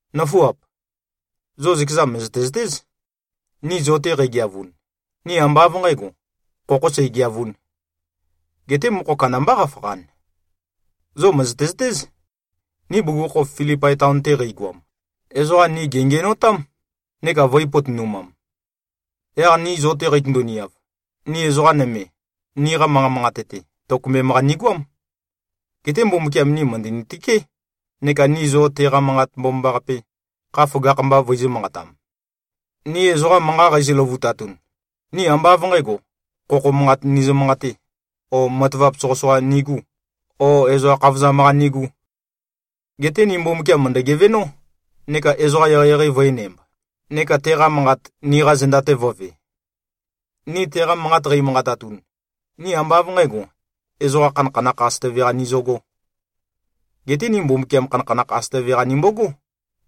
Nǿfuap! Zo zøkeza mø̀zøte-zøtéz, ni zo-te qeigeavun, ni ambá av nqǣgo, khokhō seigeavūn. Geté mokho kandambá qafakhan. Zo mø̀zøte-zøtéz, ni bugukhokhof Filipai taon-te qeigoam, ezoqa ni gèngiænotám, neka vø̄i-potonumam. Yaq ni zo-te qeitøndu-niav, ni ezoqa nøme, niqa manqa manqate-te tokømbem-qa nigoám. Geté Mbumbukiam ni mø̀ndøni-tøké, neka ni zo teqa Manqat Mbomambaqape, kha føgakh-mba vøizø̄-manqatam. Ni ezoqa manqa qeizø-løvutatun, ni ambá av nqǣgo, khokho manqat nizø-manqatē o matavap soqøsoqa nigū o ezoqa khavozam-qa nigū. Geté ni Mbumbukiam mø̀ndø-gevenó neka ezoqa eqeieqei vø̄enæmb, neka teqa manqat, niqa zenda-te vō꞉ve. Ni teqa manqat qeimanqatatun, ni ambá av nqǣgo, ezoqa khanakhanakh asøtøve-qa nizøgō. Geté ni Mbumbukiam khanakhanakh asøtøve-qa nimbogó,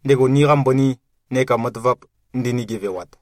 ndego niqa mbøni neka matavap ndini-gevewat.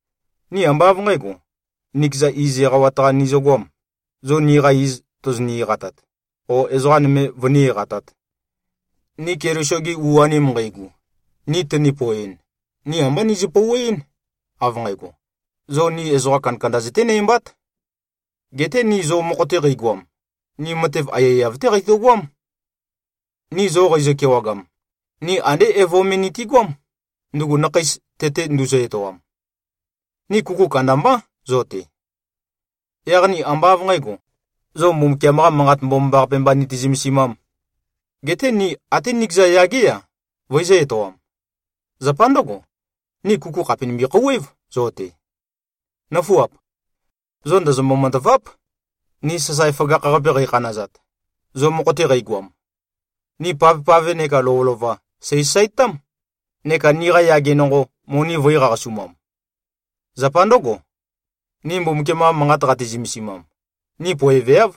Ni ambá av nqǣgo, nikeza iz eqawat-qa nizøgoām, zo niqa iz tozoni-eqatat, o ezoqa nøme vøní-eqatāt. Ni Keliso-gi u-anim nqeigu, ni tøni-poeɨn, ni ambá nizø-pouweɨ́n, av nqægo, zo ni ezoqa kandakanda zøténæmbát. Geté ni zo mokho-te qeigoam, ni matev aiyaiyav-té qeitøgoám. Ni zo qeizø-kewagam, ni andé evo me nitigoám, ndugu nakheis tete nduzø-etoam. Ni kuku kandambá zo-te. Yaq ni ambá av nqǣgo, zo Mbumbukiam-qa Manqat Mbomambaqape mba niti-zømesimām. Geté ni até nikeza yagé-a, vøizø̄-etoam. Zapa ndǿgo, ni kuku khàpe nimbi-khouwév zo-te. Nǿfuap! Zo ndozombo-matâváp, ni sasae føgakh-qape qeikhanazat, zo mokho-te qeigoam. Ni pavpave nekā lovølova, sèisasaetám, neka niqa yage nonqo, moni vø̄i-qaqasumam. Zapa ndǿgo, ni Mbumbukiam-qa Manqat qati-zømesimam, ni poeveáv,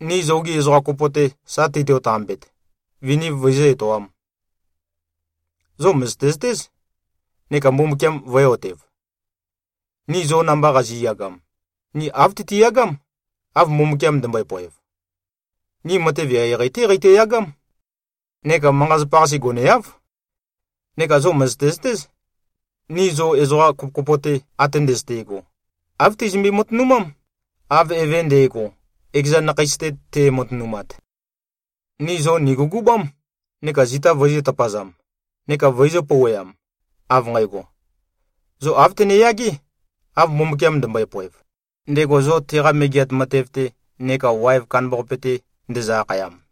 ni zogi ezoqa kopo-te sa teito-tambet, viniv vøizǿ-etoām. Zo mø̀zøte-zøtéz neka Mbumbukiam vø̄e-otev, ni zo namba qazi꞉yagam, ni āv tøtiyagám, av Mbumbukiam ndømbøe-poev. Ni matev eqeieqei-té qeitøyagám neka manqa-zapa-qase goneáv. Neka zo mø̀zøte-zøtéz, ni zo ezoqa kopokopo-te, ate ndøzøte꞉go, āv teizømbe-matønumám, av eve nde꞉go, ekeza nakheis-te te꞉matønumat. Ni zo nìgugubám neka zita vøizø̄-tøpazam neka vøizø̄-pouweam, av nqægo: Zo āv tøneyagé, av Mbumbukiam ndømbøe-poev, ndego zo teqa megeat matev-te neka waev kandambaqape-te ndezø-akhayam.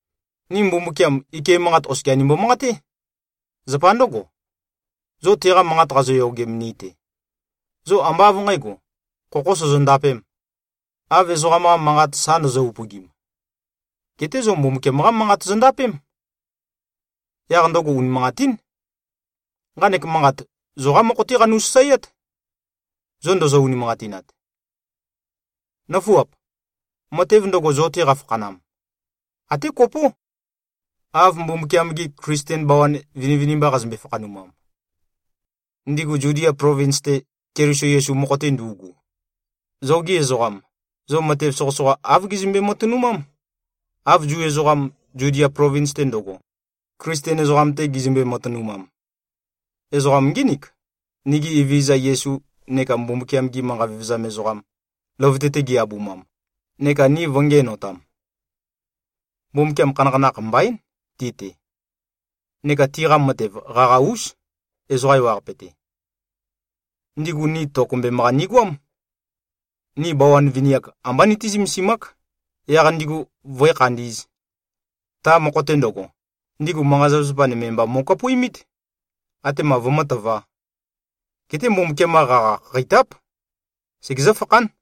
Ni Mbumbukiam, ike manqate oskia nimbo-manqaté. Zapa ndǿgo, zo teqa manqat qazoyogem ni-te, zo ambá av nqǣgo, khokho sozondapēm, av ezoqam-qa manqat sa ndozo-upøgim. Geté zo Mbumbukiam-qá Manqat zondapém. Yaq ndøgo unimanqatín. Nqanek manqat, zoqá mokho-té qanu-sasaeát, zo ndozo-unimanqatinat. Nǿfuap! Matev ndøgo, zo-te qafakhanam, até kopó, av Mbumbukiam-gi Klisten bawan vinivinimba qazømbe-fakhanumam, ndigu Zudia plovins-te, Keliso Yesu-qa mokho-te ndu꞉gu. Zogi ezoqam, zo matev soqøsoqa, āv gizømbe-matønumám, av Zu ezoqam, Zudia plovins-te ndøgo, Klisten ezoqam-te gizømbe-matønumam. Ezoqam ngínik, nigi Evezøza Yesu neka Mbumbukiam-gi manqa vevezam ezoqam, løvøte-te gi-abumam neka ni vø̄ngiænotam. Mbumbukiam khanakhanakh mbaín ti-te. Neka tiqa matev qaqa-ús, ezoqa ewaqape-te. Ndigu ni tokømbem-qa nigoám. Ni bawan vini-ak, ambá nití-zømesimák, yaq ndigu vǿe-khandī꞉z. Ta mokho-te ndøgo, ndigu manqa-zapazapa nøme mba mo꞉kapuimít, atema vømǿtøvā. Geté Mbumbukiam-qa qaqa khakheitáp. Segezǿ-fakhán.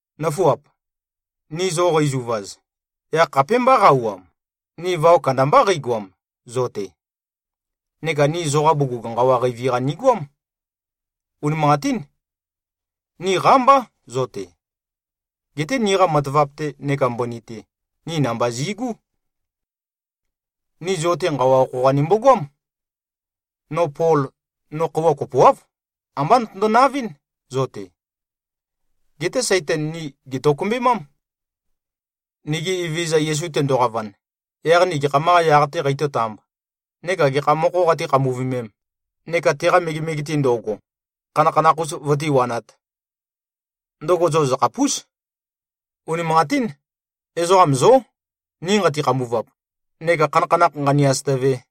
Nǿfuap! Ni zo qeizuvaz, yaq khapémbá qa-auwam, ni vao kandambá qeigoam, zo-te. Neka ni zoqa bugug nqawa qeivi-qa nigoám. Unimanqatín. Ni qámbá zo-te. Geté niqa matavap-te neka mbøni-te, ni namba zi꞉gú. Ni zo-te nqawa okho-qa nimbogoám. No Pol, no khøuwa kopoáv, ambá notøndo-navɨ́n, zo-te. Geté Saitan ni gètokømbemám. Nigi Evezøza Yesu tendoqavan, yaq ni gekham-qā yaq-tē qeitǿ-tāmb neka gekha mokhō qatí-khambuvemēm neka teqa megemege-te ndo꞉go, khanakhanakh-us vøtíwanāt? Ndøgo zo zøkhapús. Unimanqatín. Ezoqam zó, ni nqati-khambuvap neka khanakhanakh nqānī-āsø̄tø̄vē.